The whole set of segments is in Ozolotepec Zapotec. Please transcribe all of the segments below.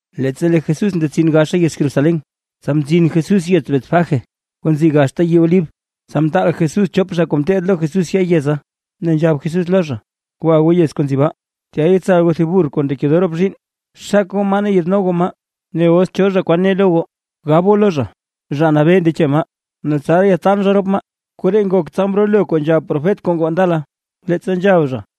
Leettsa lee Jesús ndetsin gaxa yez Jerusalén, tsa mzin Jesús yez Betfagé kuu nzi gaxta yii Olib, tsa mtaal Jesús chop zha kuu ngeteed lo Jesús ya yeza, ne nzhab Jesús lo zha: ―Gwa goo yez kuu nzi baa. Tya yetsal goo thib burr kuu ndekedoo rop zhiinn. Xak goo maa ne yaadno goo maa. Ne os cho zha kwan ne lo goo, gab goo lo zha: “Zha Nabee ndeche maa, ne tsaraa yaadtaan zha rop maa”. Koree ngok, tsa mrolo re kuu nzhab profet kuu ngoo ndala, leettsa nzhab zha: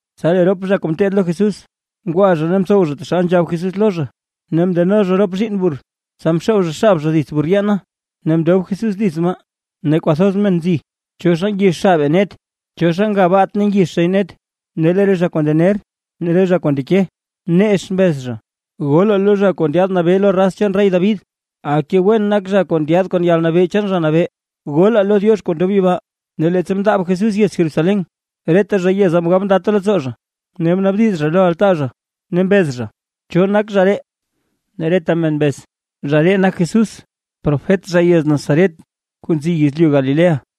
Tsa lee rop zha kuu ngeteed lo Jesús, ngwa zha ne mtsow zha taxal nzhab Jesús lo zha. Ne mndeno zha rop zhiinn burr, tsa mxoob zha xab zha dits burr yeena, ne mndob Jesús dits maa. Ne kwathoz men nzi, cho zha ngix xabe net, ne cho zha nga baat ne ngix zhay net. Ne lee re zha kuu ndener ne re zha kuu ndeke, nex mbez zha: ―¡Golaa lo Zha kuu ndyaad Nabee lo raz chaan rey David! ¡Aka wen nak zha kuu ndyaad kon yalnabee chaan Zha Nabee! ¡Golaa lo Diox kuu ndob yibaa! Ne leettsa mndaab Jesús yez Jerusalén, reta zha yeza mgab ndata leettsoo zha, ne mnaabdiz zha lo altaa zha, ne mbez zha: ―¿Cho nak zha ree? Ne reta men mbez: ―Zha ree nak Jesús, profet zha yez Nazaret kuu nzi yezlyu Galilea.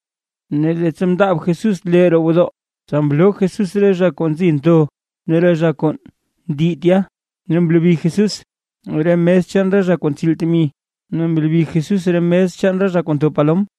Ne leettsa mndaab Jesús lee roo gwodoo, tsa mloo Jesús re zha kuu nzi ntho ne re zha kuu ndi tya. Ne mlobi Jesús re mes chaan re zha kuu ntsiil temi, ne mlobi Jesús re mes chaan re zha kuu ntho palom.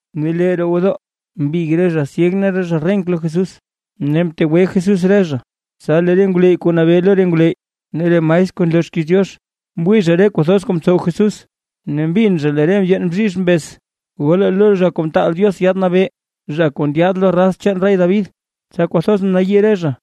Ne lee roo gwodoo mbig re zha syeg ne re zha renk lo Jesús, ne mtegwe Jesús re zha. Tsa lee re ngwleyy kuu nabee lo re ngwleyy ne re maestr kuu nloo xkiiz Diox, mwii zha re kuu thoz kuu mtsow Jesús, ne mbin zha lee re ndyeen bzhizh mbez: “¡Golaa lo Zha Kuu Mtaal Diox Yaad Nabee, zha kuu ndyaad lo raz chaan rey David!”, tsa kwathoz mnayii re zha.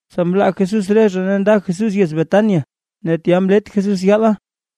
Tsa mlaa Jesús re zha ne nda Jesús yez Betania, ne tya mlet Jesús yaala.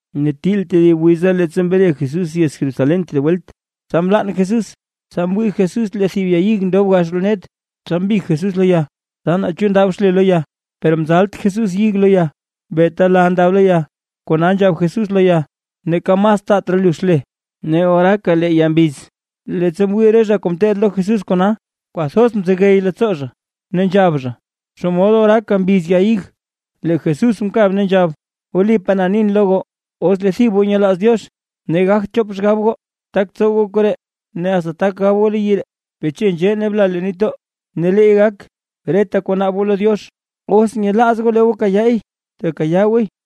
Ne til tedib wiza leettsa mre Jesús yez Jerusalén tedib welt, tsa mlann Jesús. Tsa mwii Jesús lee thib ya ig ndob gax roo net, tsa mbig Jesús lo ya, tsa naa chu ndab xle lo ya, per mzalt Jesús ig lo ya beeta la ndab lo ya. Kona nzhab Jesús lo ya: ―Neeka mas taat raa lu xle. Ne oraaka lee ya mbiz. Leettsa mwii re zha kuu ngeteed lo Jesús kona, kwathoz mzegey leettsoo zha ne nzhab zha: ―¡Xomod oraaka mbiz ya ig! Lee Jesús mkab ne nzhab: ―Wlipaa na nin lo goo, os lee thib goo nyelaaz Diox ne gagt chop xgab goo, tak tsow goo koree ne asta tak gab goo lo yii ree: “Beche nzhee ne bla leen nitdoo”, ne leey gak. Reta kuu naab goo lo Diox, os nyelaaz goo lee goo kayaay, tekayaa gooy.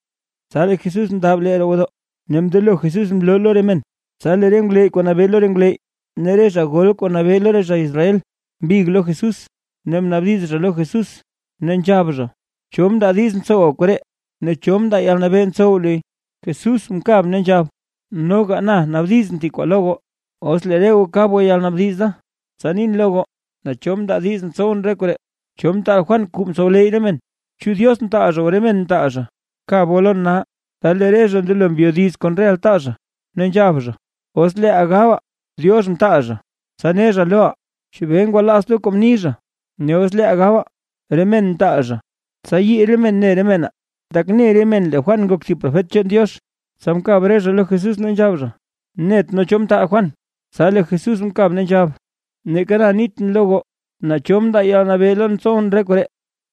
Tsa lee Jesús mndaab lee roo gwodoo, ne mndelo Jesús mloo lo re men, tsa lee re ngwleyy kuu nabee lo re ngwleyy, ne re zha gol kuu nabee lo re zha Israel, mbig lo Jesús, ne mnaabdiz zha lo Jesús, ne nzhab zha: ―¿Cho mndaa diiz ntsowa koree? ¿Ne cho mndaa yalnabee ntsow luy? Jesús mkab ne nzhab: ―Noga na naabdizʼn thib kwaa lo goo. Os lee re goo kab goo yalnaabdiz da, tsa nin lo goo naa cho mndaa diiz ntsowʼn ree koree. ¿Cho mtaal Juan kuu mtsowleyy re men? ¿Chu Diox mtaal zha o re men mtaal zha? ¡Kab goo lon nal! Tsa lee re zha mndelo mbyodiz kon re altaa zha, ne nzhab zha: ―Os leeʼaa gabaa: “Diox mtaal zha”, tsa ne zha loʼaa: “¿Chebee ngwalaazt goo kuu mni zha?” Ne os leeʼaa gabaa: “Re men mtaal zha”, tsa yii re men ne re menaa, tak ne re men lee Juan nak thib profet chaan Diox. Tsa mkab re zha lo Jesús ne nzhab zha: ―Net nee cho mtaal Juan. Tsa lee Jesús mkab ne nzhab: ―Neeka na nitʼn lo goo naa cho mndaa yalnabee lon ntsowʼn re koree.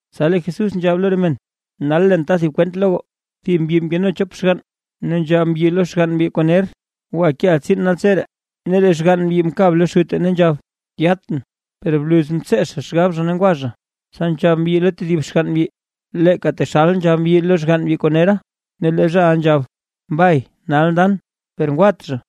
Tsa lee Jesús nzhab lo re men: ―Nal leen ta thib kwent lo goo. Thib mbyi mkeno chop xgann, ne nzhab mbyi lo xgann mbyi kuu ner: “Gwa keʼa tsiin naltseree”. Ne lee xgann mbyi mkab lo xute ne nzhab: “Yatʼn”. Per bluz mtsee zha xgab zha ne ngwa zha. Tsa nzhab mbyi lo tedib xgann mbyi, leeka taxal nzhab mbyi lo xgann mbyi kuu nera. Ne lee zhaʼa nzhab: “Mbay, nal ndan”. Per ngwat zha.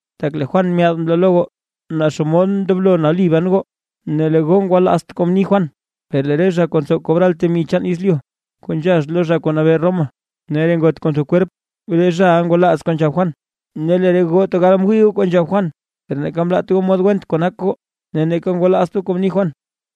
Tak lee Juan myaad mloo lo goo, naa xomod ndoblo nali ban goo, ne lee goo ngwalaazt goo kuu mni Juan. Per lee re zha kuu ntsow kobral temi chaan yezlyu kuu nzhax lo zha kuu nabee Roma, ne re ngot kuu ntho kwerp, re zhaʼa ngwalaaz kuu nzhab Juan, ne lee re goo tegal mwii goo kuu nzhab Juan, per neeka mlaat goo mod went kuu nak goo, ne neeka ngwalaazt goo kuu mni Juan.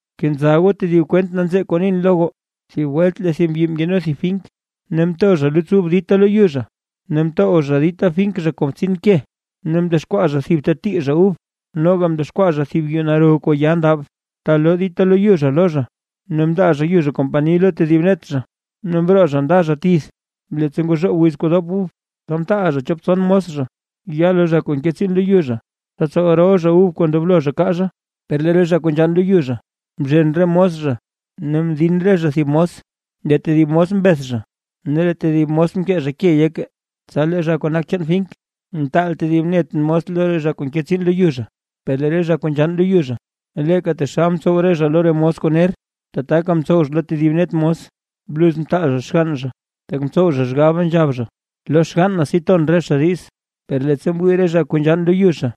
’Kenza goo tedib kwent nanzee kuu nin lo goo: Thib welt lee thib mbyi mkeno thib fink, ne mto zha luts ub dita lo yu zha. Ne mtow zha dita fink kon btsin ke. Ne mdexkwaa zha thib ta tii zha ub, noga mdexkwaa zha thib yuu naro kuu ya ndab, ta loo dita lo yu zha lo zha. Ne mndaa zha yu zha kompani lo tedib net zha, ne mroo zha nda zha tith. Leettsa ngozhoob wiz kuu dop ub, tsa mtaal zha chop tson mos zha, ya lo zha kuu nke tsiin lo yu zha, tsa tsow rol zha ub kuu ndoblo zha kaa zha. Per lee re zha kuu nzhann lo yu zha, mzhen re mos zha, ne mdin re zha thib mos, lee tedib mos mbeth zha ne lee tedib mos mkee zha ke yeke. Tsa lee zha kuu nak chaan fink, mtaal tedib net mos lo re zha kuu nke tsiin lo yu zha; per lee re zha kuu nzhann lo yu zha, leeka taxal mtsow re zha lo re mos kuu ner, tataka mtsow zha lo tedib net mos. ’Bluz mtaal zha xgann zha, tak mtsow zha xgab, nzhab zha: “Lo xgann na si ton re zha diz”. Per leettsa mwii re zha kuu nzhann lo yu zha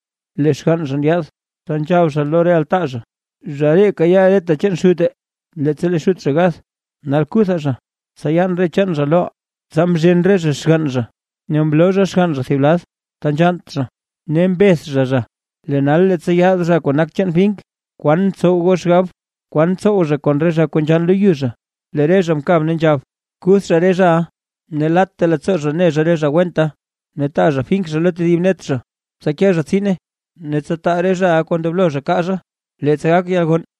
lee xgann zha ndyaad, tsa nzhab zha lo re altaa zha: “Zha ree kayaa reta chaan xute, leettsa lee xut zha gath. Nal kuthaa zha, tsa yaan re chaan zha loʼaa.” Tsa mzhen re zha xgann zha ne mloo zha xgann zha thib lad, ta nzhannt zha ne mbeth zha zha. ’Lee nal leettsa yaad zha kuu nak chaan fink, ¿kwan ntsow goo xgab, kwan tsow zha kon re zha kuu nzhann lo yu zha? Lee re zha mkab ne nzhab: ―Kuth zha re zhaʼa, ne latta leettsoo zha ne zha re zha wenta, ne taa zha fink zha lo tedib net zha, tsa ke zha tsiina, ne tsa taa re zhaʼa kuu ndoblo zha kaa zha leettsa gak yalgonn.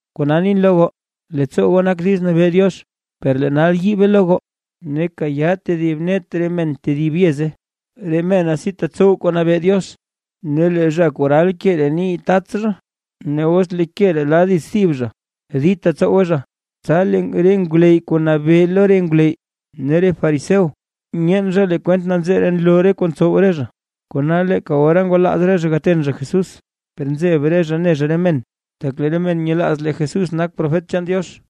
Kona nin lo goo: Leettsoo goo nak diiz nabee Diox, per lee nal yiibe lo goo ne kayaa tedib net re men tedib yeze, re mena si tetsow kuu nabee Diox. Ne lee zha kuu ral ke ree nii tats zha; ne os lee ke ree la dits thib zha, dita tsowe zha. Tsa lee re ngwleyy kuu nabee lo re ngwleyy ne re fariseo, myeen zha lee kwent nanzee ree nloo re kuu ntsow re zha. Kona leeka ora ngwalaaz re zha gaten zha Jesús, per nzeb re zha ne zha re men, tak lee re men nyelaaz lee Jesús nak profet chaan Diox.